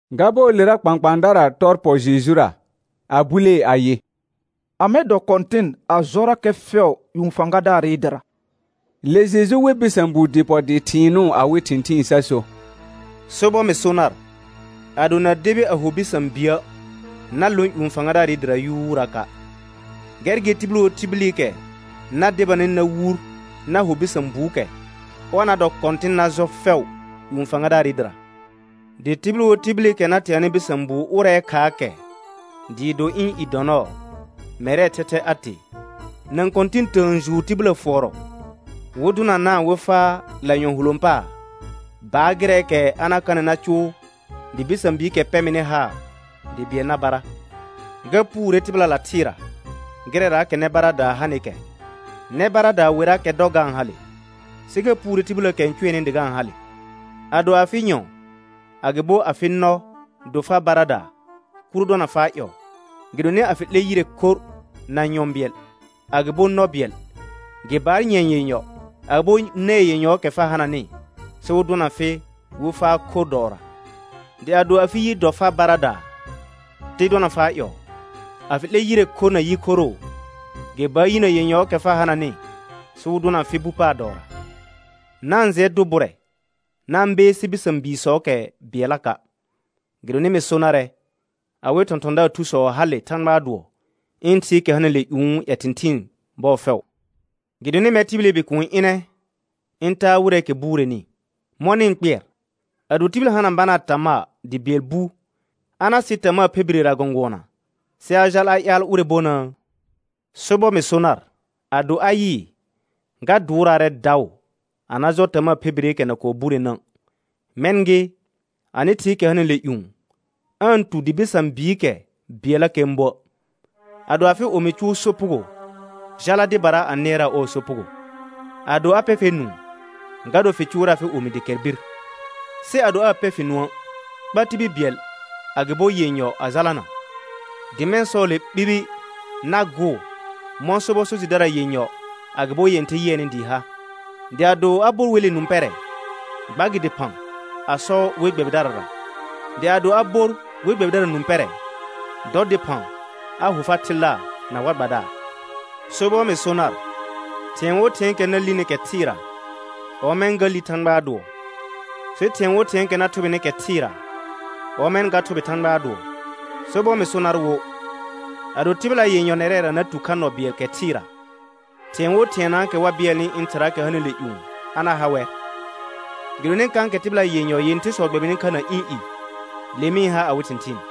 Ga bɔɔlera kpãkpãadara tɔ pɔ Jejura, a bulee ayɩ: Amɛ dɔ kɔ̃tɩn a jɔrakɛ fɛʋ ƴũ fãgadaarɩ dɩra? Le Jeju we bɩsã buu dɩ pɔ dɩ thɩɩnʋʋ awɩ thɩ̃thɩɩn sa so: Sobɔr mɩ so nar, ado na debi a ho bɩsã biə', na lõ ƴũ fãgadaarɩ dɩra yuuraka'. Gɛr gɩ tibil wo tibilikɛ na debanɩ na wur na ho bɩsã buukɛ, ɔr na dɔ kɔ̃tɩn na jɔ fɛʋ ƴũ fãgadaarɩ dɩra, dɩ tibil wo tibilikɛ na teanɩ bɩsã buu ʋrɛɛ khaa kɛ, dɩɩ do ɩ̃ i dɔ nɔɔ, mɛrɛɛ thɛthɛ a tee. Nã kɔ̃tɩ̃ tə̃ə juur tibillə fʋɔrɔ wɩ dʋnanaa wɩ faa lanyɔ̃ hulõ paar, baar gɩrɛɛkɛ a na kanɩ na cʋʋ dɩ bɩsã biikɛ pɛ mɩnɩ haar dɩ bɩɛl na bara. Ga puure tɩbɩlala thɩɩra gɩrɛraakɛra nɛ baradaa hanɩkɛ. Nɛ baradaa werrakɛ dɔ ga-n hale, sɩ ga puure tibilləəkɛ n cʋɛnɩ dɩ ga-n hale. Ado afɩ nyɔ̃ agɩbo afɩ nɔ do far baradaa, kuro dɔna faa ƴɔɔ. Gɩdonɩ a fɩ 'lɛ yire khorr na nyɔ̃ bɩɛl agɩbo nɔ bɩɛl, gɩ baar nyɛ̃ɛ yenyɔ agɩbo nɛɛ yenyɔɔkɛ fa hananɩ, sɩ wɩ dʋna fɩ wɩ faa khorr dɔɔra. Dɩ ado afɩ yi dɔ far baradaa, te dɔna faa ƴɔɔ. A fɩ 'lɛ yire khorr na yi khoroo, gɩ baar yinə yenyɔɔkɛ fa hananɩ sɩ wɩ dʋna fɩ bu paar dɔɔra. Na-n jɩɛ dʋ bʋrɛ na-n beesi bɩsã biisɔɔkɛ bɩɛllaka'. Gɩdonɩ mɩ so narɛ, awɩ thɔ̃thɔ̃daar thusɔ hale Thãgbaa dʋɔ ɩ̃ Thɩɩkɛ hanɩle ƴũu ƴɛ thɩ̃thɩɩn bɔɔ fɛʋ. [Gɩdonɩ mɛr tibili Bikuun ɩnɛ ɩ̃ taa wɩrɛɛkɛ bureni.] Mɔ̃ nɩ-n kpɩɛr? Ado tibil hana banaa tamaa dɩ bɩɛl bu, a na sɩ tamaa phe birera gɔ̃gʋɔna sɩ a jal a ƴaal ʋrɛ bonəə? Sobɔr mɩ so nar ado a yɩɩ, ga dʋʋraarɛ daʋ a na jɔ tamaa phe bireekɛ na burenə'; mɛ̃ gɩ, anɩ Thɩɩkɛ hanɩle ƴũ, aa-n tu dɩ bɩsã biikɛ bɩɛllakɛ n buə'. Ado afɩ omi cʋʋ sopugo, jala dɩbara a nɩɛraa ɔɔ sopugo. Ado a pɛ fɛr nũu, ga dor fɩ cʋʋrɛ afɩ omi dɩ kɛr bir. Sɩ ado aa pɛ fɩ nũə', kpa tibil bɩɛl agɩbo yenyɔ a jalana, dɩ mɛ̃ «sɔɔle ɓibi na gʋʋr mɔ̃ sobɔ so jɩdara yenyɔ agɩbo yẽɩher yɩɛnɩ dɩɩ ha.» Dɩ ado a bor wele nũ pɛrɛ, gba gɩ dɩphã a sɔ we gbɛbɩdarara. Dɩ ado a bor we gbɛbɩdara nũ pɛrɛ, dɔ dɩphã a ho far thilaar na war gbadaar. Sobɔr mɩ so nar, thɩ̃ɛ wo thɩ̃ɛɛkɛ na lini kɛ thɩɩra, ɔmɛ̃ ga li Thãgbaa dʋɔ. Sɩ thɩ̃ɛ wo thɩ̃ɛɛkɛ na thʋbɩnɩ kɛ thɩɩra, ɔmɛ̃ ga thʋbɩ Thãgbaa dʋɔ. Sobɔr mɩ so nar wo, ado tɩbɩla yenyɔ nɛrɛra na tu kha nɔ bɩɛl kɛ thɩɩra, thɩ̃ɛ wo thɩɛnaakɛ wa bɩɛlnɩ ɩ̃ Thɩraakɛ hanɩle ƴũ, a na ha wɛr. Gɩdonɩ kãkɛ tɩbɩla yenyɔ yẽthersɔ gbɛbɩnɩ kha na ɩ̃ i, le mɩ-n ha awɩ thɩ̃thɩɩn.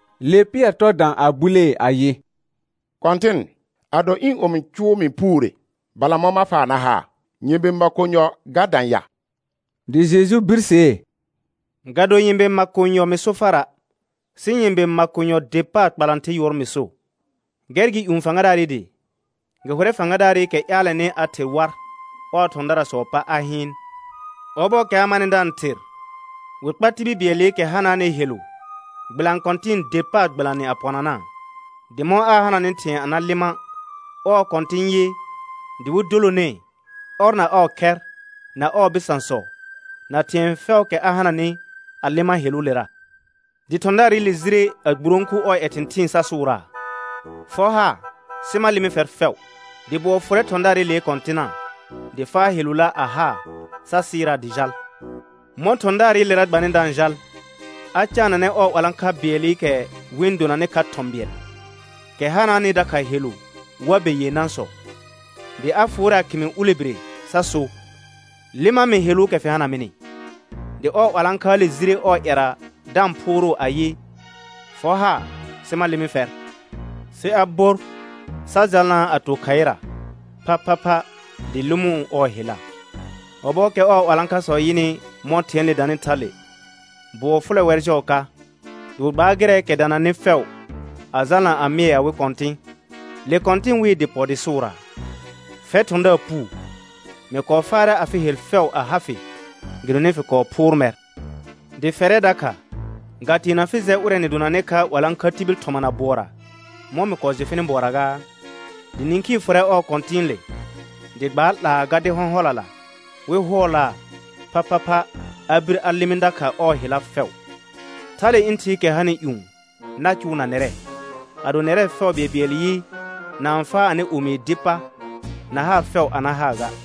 Le Pɩɛr tɔ dã a bulee ayɩ: Kɔ̃tɩn, ado ɩ̃ omi cʋʋ mɩ puure, balamɔ̃ ma faa na haa? Nyɛ̃be makonyɔ ga dã ya? Dɩ Jeju birsee: Ga do nyɛ̃be makonyɔ mɩ so fara', sɩ nyɛ̃be makonyɔ der paar kpalãther yʋɔr mɩ so. Gɛr gɩ ƴũ fãgadaarɩ dɩ, gɩ hʋrɛ fãgadaarɩkɛ ƴaalɛnɩ a ther war ɔɔ thɔ̃daarsɔɔ pa a hɩɩn. Ɔbɔɔkɛ a manɩ da-n ther, wɩ kpar tibil bɩɛlɩkɛ hanaanɩ helu gbɩlanɩ kɔ̃tɩ̃ der paar gbɩlanɩ a pɔnanaa. Dɩ mɔ̃ aa hananɩ thɩ̃ɛ a na lɩma', ɔɔ kɔ̃tɩ̃ yɩ dɩ wɩ dolonee, ɔr na ɔɔ khɛr, na ɔɔ bɩsãsɔ, na thɩ̃ɛ fɛʋʋkɛ a hananɩ a lɩma heluulera. Dɩ thɔ̃daarɩle jire a gburõku ɔɔ ƴɛ thɩ̃thɩɩn sa sʋʋraa: Fɔ haar sɩ ma lɩmɩ fɛr fɛʋ. Dɩ bʋɔ fʋrɛ thɔ̃daarɩlee kɔ̃tɩna, dɩ faa helula a haa, sa sɩɩraa dɩ jal. Mɔ̃ thɔ̃daarɩlera gbanɩ da-n jal, a caananɛ ɔɔ 'walãkha bɩɛlɩkɛ wɩ-n donanɩ kha thɔ̃ bɩɛl, kɛ hanaanɩ dakha helu war be yenãsɔ. Dɩ a fʋʋrɛ a khɩmɩ ulebire sa so: Lɩma mɩ heluukɛ fɩ hana mɩnɩ. Dɩ ɔɔ 'walãkhaale jire ɔɔ ƴɛra da-n phʋʋrʋʋ ayɩ: Fɔ haar sɩ ma lɩmɩ fɛr. Sɩ a bor sa jalnaa a to khaɩra phaphapha dɩ lɩmʋʋ ɔɔ hella. Ɔbɔɔkɛ ɔɔ 'walãkhasɔ yɩnɩ mɔ̃ thɩ̃ɛɛle danɩ thale, bʋɔ fʋlɛ wɛr jɔɔ ka. Dɩ wɩ gbaar gɩrɛɛkɛ dananɩ fɛʋ a jalna a mɩɛ awɩ kɔ̃tɩ̃. Le kɔ̃tɩn wɩɩ dɩ pɔ dɩ sʋʋraa: Eɛr thɔ̃daar puu, mɩ kɔɔ faarɛ afɩ hel fɛʋ a ha fɩ, gɩdonɩ fɩ kɔɔ phʋʋr mɛr. Dɩ fɛrɛ dakha ga teena fɩ jɛ ʋrɛ nɩ donanɩ kha 'walãkha tibil thɔmana bʋɔra, mɔ̃ mɩ kɔɔ jɩ fɩnɩ bʋɔra gaa? Dɩ nĩkhii fʋrɛ ɔɔ kɔ̃tɩ̃ɩle, dɩ gbaa 'laa gardɩ hɔ̃hɔlala wɩ hʋɔlaa phaphapha a bir a lɩmɩ dakha ɔɔ hella fɛʋ. Thale ɩ̃ Thɩɩkɛ hanɩ ƴũ na cʋʋ na nɛrɛ, ado nɛrɛ fɛʋ bɩɛlbɩɛl yɩ, na-n faa anɩ omii dɩ pa na haar fɛʋ a na haa ga.